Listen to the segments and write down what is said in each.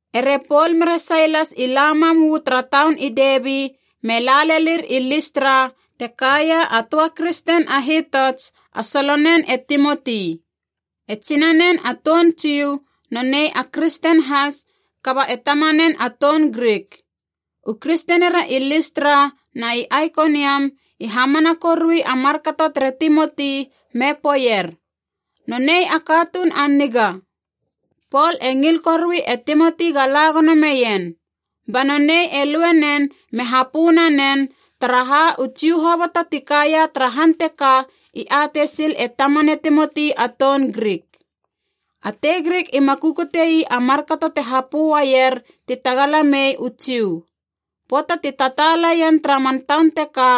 Ere Pol mere Sailas i la mam uu tara taun i Debi be la lelir i Listra te kaia a töa kristen a hitots, a solonen e Timoti. E tsinanen a toun Jiu, nonei a kristen has kaba e tamanen a toun Grik. U kristenira i Listra na i Aikoniam i hamana korui a markato tere Timoti me poeier, “Nonei a katuun a niga.” Pol e ngil korui e Timoti ga la gono meien. Ba nonei e lue nen me hapö nanen, taraha, u Jiu hoboto ti kaia tara han teka i atei sil e tamane Timoti a toun Grik. A tei Grik ima kukute ii a markato te hapö uaier ti tagala mei u Jiu. Pöata ti tataala ien tara man taun teka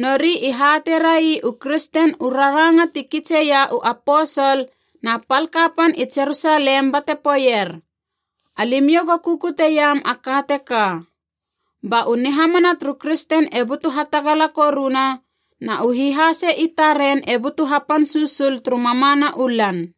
nori i hateirai u kristen u raranga ti kitseia u aposol na pal kapan i Jerusalem bate poeier, “Alimiou go kukuteiam a ka teka.” Ba u nihamana turu kristen e butu hatagala koruna, na u hihase i taren e butu hapan susul turu mamana u lan.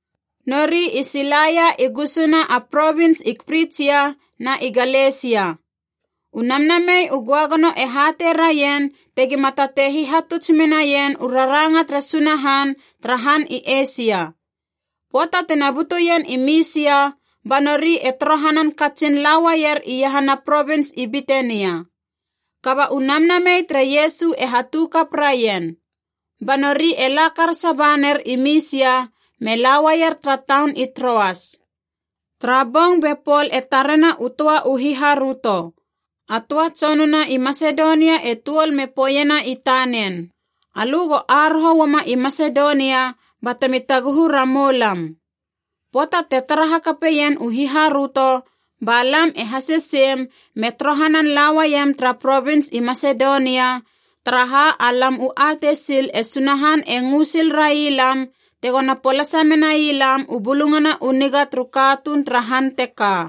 Nori i silaia i gusuna a provins i Prigia na i Galesia. U Namnamei u Göagono e hatei raien tegima tatei hihatuts menaien u raranga tere Sunahan tara han i Eisia. Pöata tina butuien i Misia, ba nori e torohanan katsin la uaier iahana a provins i Bitenia. Kaba u Namnamei tere Iesu e hatu kap raien. Ba nori e la karasa ba ner i Misia me la uaier tara taun i Troas. Tara bong be Pol e tarena u töa u hiharöto. A töa tsonuna i Masedonia e tuol me poeiena i tanen, “Alö go aroho uama i Masedonia batemi taguhu ramou lam!” Pöata te tara hakapeien u hiharöto, ba lam e haseseim me torohanan lauaiem tara provins i Masedonia, taraha alam u atei sil e Sunahan e ngö sil rai lam tegona polasa menai lam u Bulungana u Niga turu katuun tara han teka.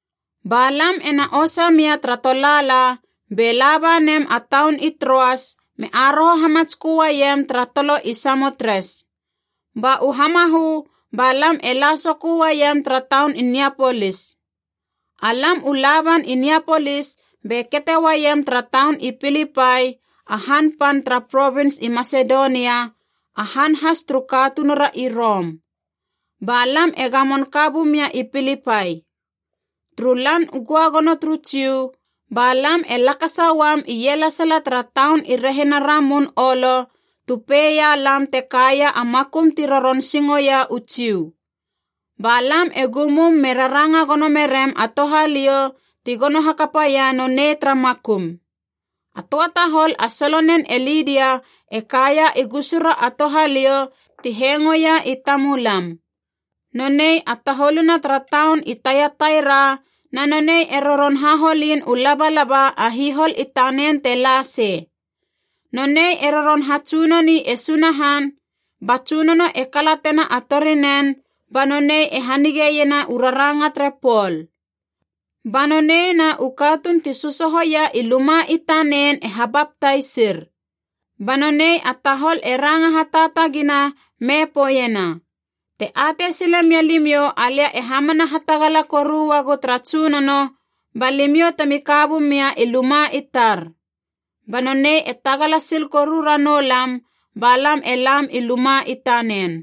Ba lam ena osa mia tara tolaala be laba nem a taun i Troas me aroho hamatskö uaiem tara tolo i Samotres. Ba u hamahö ba lam e la sokö uaiem tara taun i Niapolis. Alam u laban i Niapolis be kete uaiem tara taun i Pilipai, a han pan tara provins i Masedonia, a han has turu katunura i Rom. Ba lam e gamon ka bumia i Pilipai. Turu Lan u Göagono turu Jiu, ba lam e lakasa uam ielesala tara taun i rehina ramun olo tu peia lam te kaia a makum ti roron singoia u Jiu. Ba lam e gumum me raranga gono merem a touhaliou ti gono hakapaia nonei tara makum. A töa tahol a solonen e Lidia e kaia i gusura a touhaliou ti hengoia i tamulam. Nonei a taholuna tara taun i Taiataira na nonei e roron haholin u labalaba a hihol i tanen te la sei. Nonei e roron hatsunoni e Sunahan, ba Tsunono e kalatena a torinen ba nonei e hanige iena u raranga tere Pol. Ba nonei na u katuun ti sösohoia i luma i tanen e habaptaisir. Ba nonei a tahol e ranga hataatagina me poeiena, “Te atei sile mia limiou alia e hamana hatagala koru uagu tara Tsunono, ba limiou temi ka bumia i luma i tar.” Ba nonei e tagala sil koru ranou lam ba lam e lam i luma i tanen.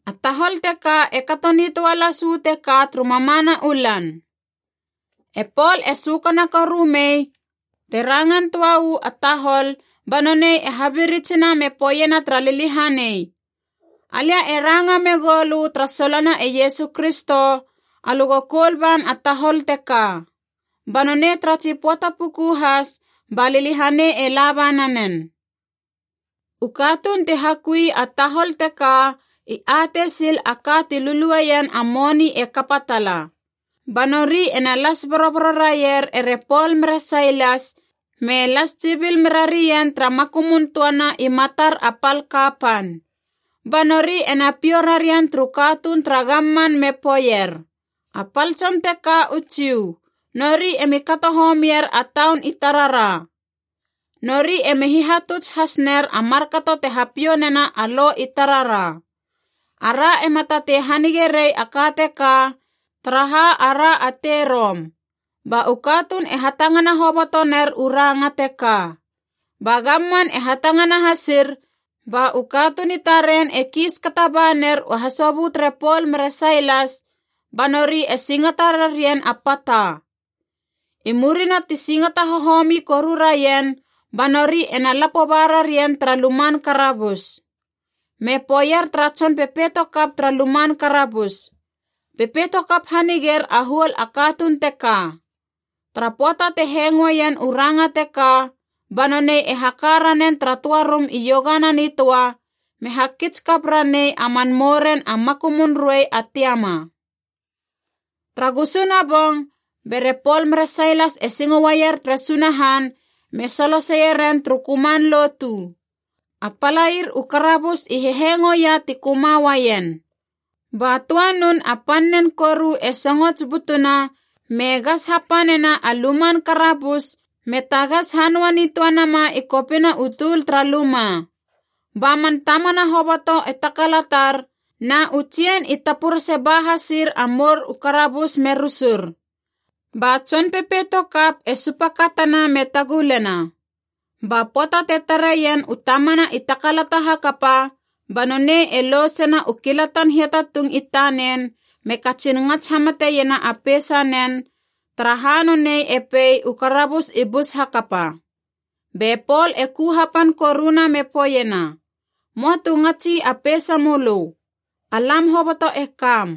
A tahol teka e kato nitöa las uu teka turu mamana u lan. E Pol e sökana koru mei te rangan töa uu a tahol ba nonei e habiritsina me poeiena tara liliahanei, “Alia e ranga megou lö tara solona e Iesu Kristo, alö go koul ban a tahol teka.” Ba nonei tara tsi pöata puku has ba liliahanei e laba nanen. U katuun ti hakui a tahol teka i atei sil a ka ti lulueien a moni e kapa tala. Ba nori ena las boroboro raier ere Pol mere Sailas me las tsibil me rarien tara makumun töana i matar a pal kapan. Ba nori ena piou rarien turu katuun tara gamman me poeier, “A pal tson teka u Jiu, nori emi kato homier a taun i tarara. Nori emi hihatuts has ner a markato te hapiou nena a lo i tarara. Ara ema tatei hanige rei a ka teka, taraha ara a tei Rom.” Ba u katuun e hatangana hoboto ner u ranga teka. Ba gamman e hatangana hasir ba u katuun i taren e kiis kata ba ner u hasobö tere Pol mere Sailas, ba nori e singata rarien a pata. I murina ti singata hohomi koru rarien ba nori ena lapo ba rarien tara luman karabus. Me poeier tara tson pepeito kap tara luman karabus, “Pepeito kap haniger a huol a katuun teka.” Tara pöata te hengoeien u ranga teka, ba nonei e haka ranen tara töa rum iogana nitöa me hakits kap ranei a man mouren a makumun ruei a tiama. Tara gusuna bong bere Pol mere Sailas e singo uaier tere Sunahan me soloseieren turu köman lotu, a palair u karabus i hehengoia ti köma uaien. Ba töa nun a pannen koru e songots butuna me gas hapanena a luman karabus me tagas hanöa nitöa nama i kopina u tul tara luma. Ba man tamana hoboto e takalatar, na u tsien i tapurese ba hasir a mour u karabus me rusur. Ba tson pepeito kap e supakatana me tagulena. Ba pöata te tareien u tamana i takalata hakapa, ba nonei e lousena u kilatan hiatatung i tanen me katsin ngats hamate iena a peisanen, taraha nonei e pei u karabus i bus hakapa. Be Pol e ku hapan koruna me poeiena, “Möa tu ngatsi a peisamölö! Alam hoboto e kam!”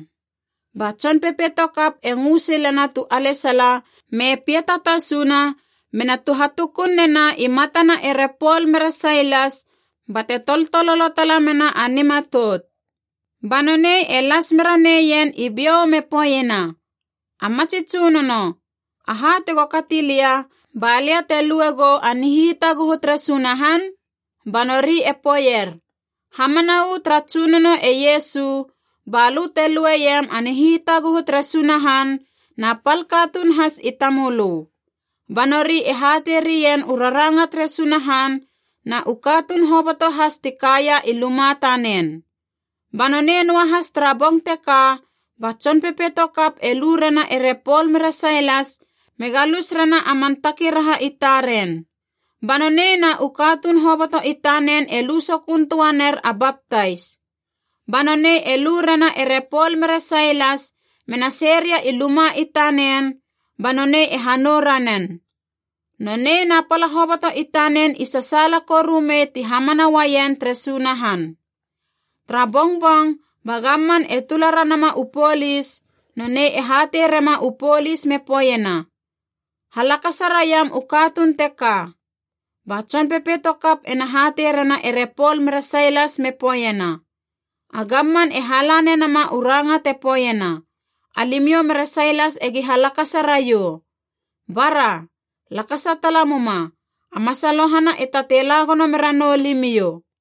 Ba tson pepeito kap e ngö silena tu alesala me piata tasuna mena tuhatukun nena i matana ere Pol mere Sailas, bate toltololo tala mena a nimatout. Ba nonei e las mera neien i biou me poeiena, “A matsi tsunono, aha tego kati lia balia te luegou a nihitaguhu tere Sunahan?” Ba nori e poeier, “Hamana uu tara Tsunono e Iesu, balö te lueiem a nihitaguhu tere Sunahan, na pal katuun has i tamölö.” Ba nori e hatei rien u raranga tere Sunahan na u katuun hoboto has ti kaia i luma tanen. Ba nonei noahas tara bong teka ba tson pepeito kap e lu rena ere Pol mere Sailas me galus rena a man takiraha i taren. Ba nonei na u katuun hoboto i tanen e lu sokön töa ner a baptais. Ba nonei e lu rena ere Pol mere Sailas mena sei ria i luma i tanen, ba nonei e hanou ranen. Nonei na pala hoboto i tanen i sasaala koru mei ti hamana uaien tere Sunahan. Tara bongbong ba gamman e tula ranama u polis, nonei e hatei rema u polis me poeiena, “Halakasa raiam u katuun teka.” Ba tson pepeito kap ena hatei rena ere Pol mere Sailas me poeiena, “A gamman e hala nenama u ranga te poeiena, alimiou mere Sailas egi halakasa raiou. Bara! Lakasa tala muma, a masalohana e tatei la gono mera noulimiou.”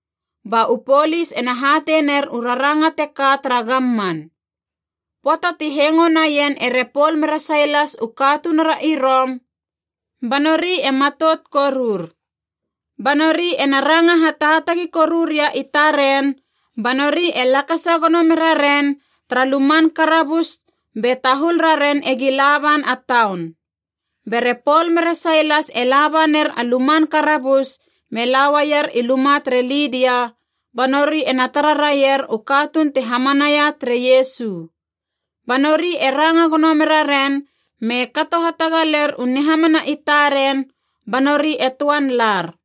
Ba u polis ena hatei ner u raranga teka tara gamman. Pöata ti hengo naien ere Pol mere Sailas u katunura i Rom, ba nori e matout korur. Ba nori ena ranga hataatagi koru ria i taren ba nori e lakasa gono mera ren tara luman karabus be tahul raren egi laban a taun. Bere Pol mere Sailas e laba ner a luman karabus me lauaier i luma tere Lidia, ba nori ena tara raier u katuun ti hamanaia tere Iesu. Ba nori e ranga gono mera ren me kato hatagaler u nihamana i taren, ba nori e töan lar.